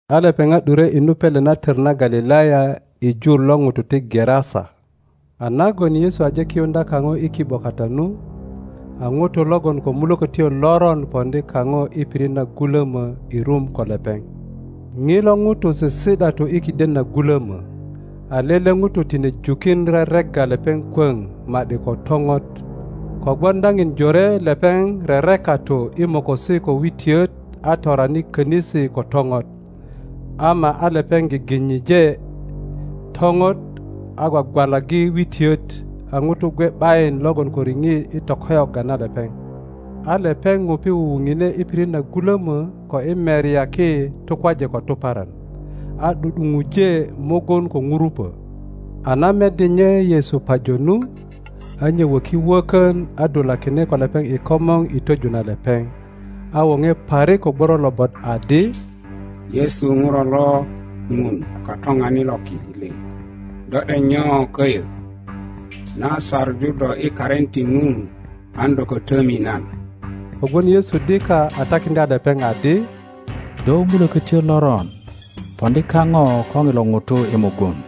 A lepeŋat ’dure i nu pele na töma Galilaya i jur lo ŋutu ti Gerasa. A nagon Yesu aje kiyuŋdya kaŋo i ki ’bo kata nu, a ŋuto logon ko mulokötyo loron poŋdi kaŋo i pirit na gulömo i rum ko lepeŋ. Ŋilo ŋuto sisi ’datu i kiden na gulömö, a lele ŋuto tine jukin reregga lepeŋ kwöŋ ma ’di ko toŋot; kogwon daŋin jore lepeŋ rerekatu i mokosi ko witiöt a torani könisi ko toŋot, ama a lepeŋ giginyije toŋot, a gwagwalaggi witiot; a ŋutu gwe ’bayin logon ko riŋit i tokoyogga na lepeŋ. a lepeŋ ŋupi wuwu ŋine i pirit na gulomö ko i merya ki tukwaje ko tuparan, a ’du ’duŋuje mugun ko ŋurupo. A na meddi nye Yesu pajo nu, a nye woki wökon a dulakine ko lepeŋ i komor i twoju na lepeŋ, a woŋe parik ko gworo lobot adi, Yesu Ŋuro lo Ŋun Katoŋanit lo ki liŋ, do ’dek nyo köyö? Nan saŋu do i karin ti Ŋun an do ko tomi nan. Kogwon Yesu dika a takiŋdya lepeŋ adi, Do mulökotyo loron, poŋdi kaŋo ko ŋilo ŋuto i mugun.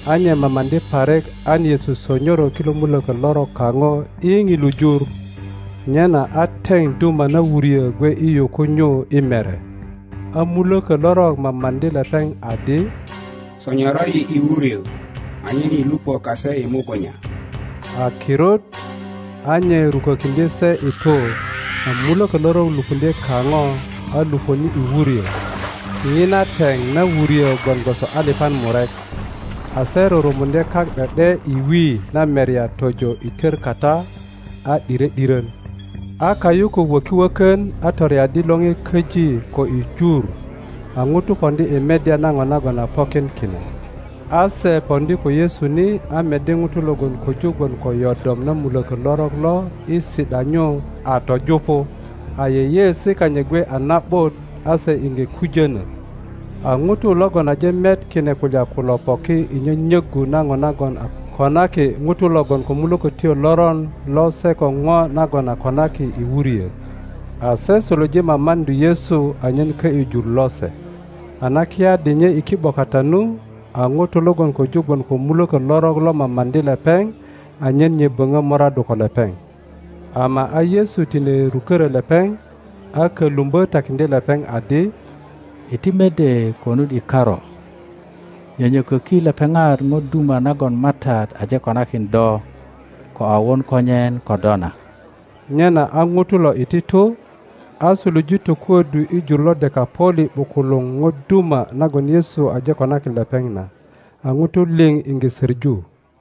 A nye mamaŋdi parik an Yesu sonyoro kilo mulökö lorok kaŋo i ŋilu jur. Nyena a teŋ duma na wuryö gwe i yuku nyu i mere; a mulökö lorok mamaŋdi lepeŋ adi, Sonyoro yi i wuryö, anyen yi lupö kase i mugunya. A kirut a nye rukökiŋdye se i tu, a mulökö lorok lupuŋdye kaŋo, a lupöni i wuryö, (ŋina teŋ na wuryö gwon gwoso alipan murek) a se rurumuŋdye kak ’de ’de i wi na merya tojo i tör kata, a ’dire ’diron. A kayukuk wöki wökön, a toreaddi lore köji ko i jur, a ŋutu poŋdi i meddya na ŋo nagon a pokin kine. A se poŋdi ko Yesu ni, a meddi ŋuto logon köju gwon ko yodom na mulökö lorok lo i si ’da nyu a töjupu, a yeyeesi kanyit gwe a na ’but; a se iŋge kujönö. A ŋutu logon aje met kine kulya kulo poki i nyonyoggu na ŋo, nagon a konaki ŋuto logon ko mulökötyo loron lo se ko ŋo nagon a konaki i wuryö. A se suluje mamaŋdu Yesu anyen ko ’yu jur lose. A na kiyaddi nye i ki ’bo kata nu, a ŋuto logon köju gwon ko mulöko lorok lo mamaŋdi lepeŋ anyen nye boŋö moraddu ko lepeŋ. Ama a Yesu tine ruköro lepeŋ, a kölumbö takiŋdye lepeŋ adi, Iti mede konut i karu, nyönyokoki lepeŋat ŋo duma nagon MATAT aje konakin do ko a won konyen ko do na. Nyena a ŋuto lo iti tu, a suluje tokuoddu i jur lo Dekaŋoli ’bukuluŋ ŋo duma nagon Yesu aje konakin lepeŋ na; a ŋutu liŋ iŋge söŋu.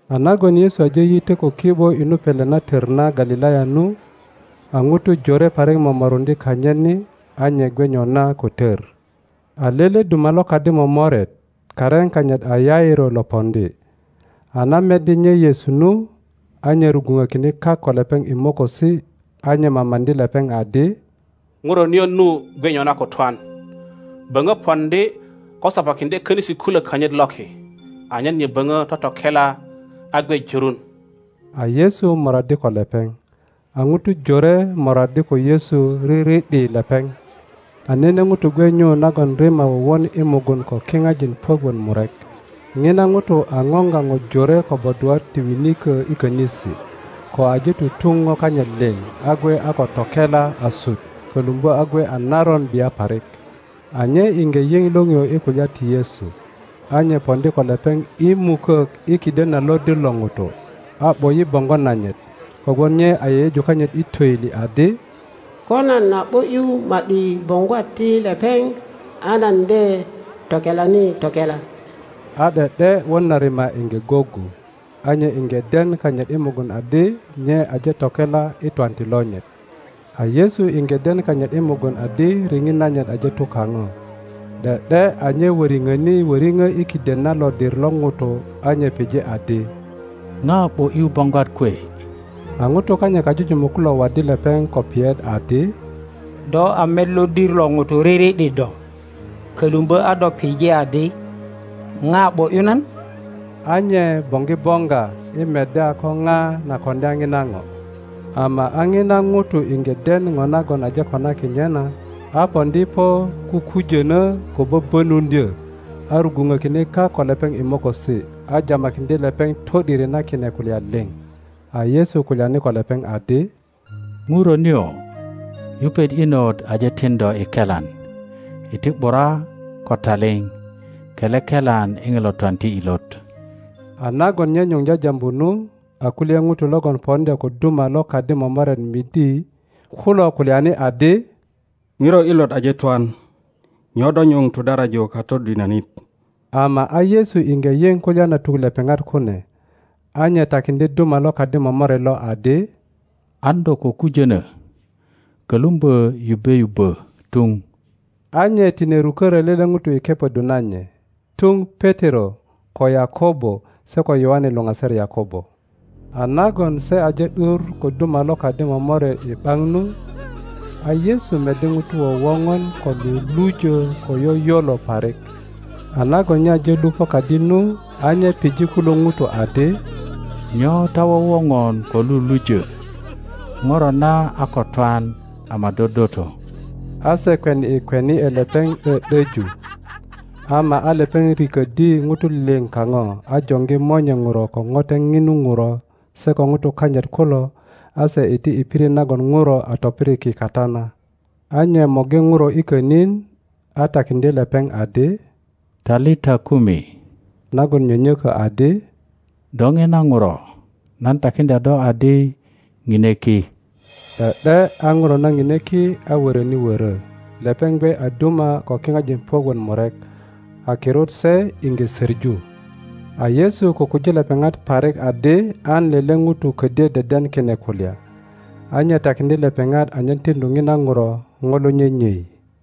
A nagon Yesu aje yitö ko ki ’bo i nu pele na tör na Galilaya nu, a ŋutu jore parik momoruŋdye kanyit ni; a nye gwe nyona ko tor. a lele duma lo kadi momoret, karin kanyit a Yairo lo poŋdi; a na meddi nye Yesu nu, a nye rugwuŋökine kak ko lepeŋ i mokosi, a nye mamaŋdi lepeŋ adi, Ŋuro nio nu gwe nyona ko twan. Böŋö poŋdi ko sopakiŋdye konisi kulok kanyit loki, anyen nye böŋö totokela a gwe jörun. a Yesu moraddi ko lepeŋ. A ŋutu jore moraddi ko Yesu riri ’di lepeŋ. A nene ŋuto gwe nyu nagon rima wowon i mugun ko kipajin puök wot murek. ŋina ŋuto a ŋoŋga ŋo jore ko bodwat ti winiko i konisi, ko aje tutuŋ po kanyit liŋ, a gwe a ko tokela asut, kolumbo a gwe a naron bia parik. a nye iŋge yiŋ liŋio i kulya ti Yesu, a nye poŋdi ko lepeŋ i mukok i kiden na lodir lo ŋutu, a ’bo ’yi boŋgo nanyit. Kogwon nye a yeyeju kanyit i toili adi, Ko nan a ’bo ’yu ma ’di boŋgwat ti lepeŋ a nan de tokelani tokela. a ’de ’de won na rima iŋge goggu; a nye iŋge den kanyit i mugun adi nye aje tokela i twanti lonyit. A Yesu iŋge den kanyit i mugun adi riŋit nanyit aje tu kaŋo, ’de ’de a nye woriŋoni woriŋo i kiden na lodir lo ŋutu a nye pije adi, ŋa ’bo ’yu boŋgwat kwe? A ŋutu kanyit kajujumuk kulo waddi lepeŋ ko piyet adi, Do a met lodir lo ŋutu riri ’di do, kolumbo a do pije adi, ŋa ’bo ’yu nan? A nye boŋgi boŋga i meddya ko ŋa na koŋdya ŋina ŋo. Ama a lon ŋuto iŋge den po nagon aje konaki nye na, a poŋdi po kukujono ko bobonuŋdyo, a rugwupökine kak ko lepeŋ i mokosi, a jamakiŋdye lepeŋ to ’diri na kine kulya lio. A Yesu kulyani ko lepeŋ adi, Ŋuro nio, yupet inot aje tin do i kelan. Iti ’bura ko taliŋ, kele kelan i ŋilo twanti ilot. A nagon nye nyuŋ jajambu nu, a kulye ŋutu logon poŋdya ko duma lo kadi momoret midi kulo kulyani adi, Ŋuro inot aje twan. Nyo do nyuŋ tudaraju Katodinonit? Ama a Yesu iŋge yiŋ kulya na tuk lepeŋat kune, a nye takiŋdye duma lo kadi momoret lo adi, An do ko kujono, kolumbo yubbe yubbo tuŋ. A nye tine rukoro lae ŋuto i kepoddu na nye, tuŋ Petero ko Yakobo se ko Yoane luŋaser Yakobo. a nagon se aje ’dur ko duma lo kadi momoret i ’baŋ nu, a Yesu meddi ŋutu wowoŋon ko lulujö ko yoyolo parik. a nagon nye aje lupo kadi nu, a nye pije kulu ŋutu adi, Nyo ta wowoŋon ko lulujö? Ŋuro na a ko twan ama dodoto. A se kweni ’e kweni ’e lepeŋ ’do ’doju. Ama a lepeŋ rikoddi ŋutu lio kaŋo, a joŋgi monye Ŋuro ko ŋote ŋinu ŋuro se ko ŋutu kanyit kulo, a se iti i pirit nagon ŋuro a topiriki kata na. a nye morgi ŋuro i konin, a takiŋdye lepeŋ adi, Talita kumi, nagon nyonyoggu adi, Do ŋina ŋuro, nan takiŋdya do adi, Ŋine ki. ’De ’de a ŋuro na ŋine ki a wöröni wörö; lepeŋ gwe a duma ko kiŋajin puök wot murek. A kirut se iŋge söŋu. a Yesu kukuji lepeŋat parik adi an lele ŋuto kodyo deden kine kulya, a nye takiŋdye lepeŋat anyen tiŋdu ŋina ŋuro ŋo lo nyenyei.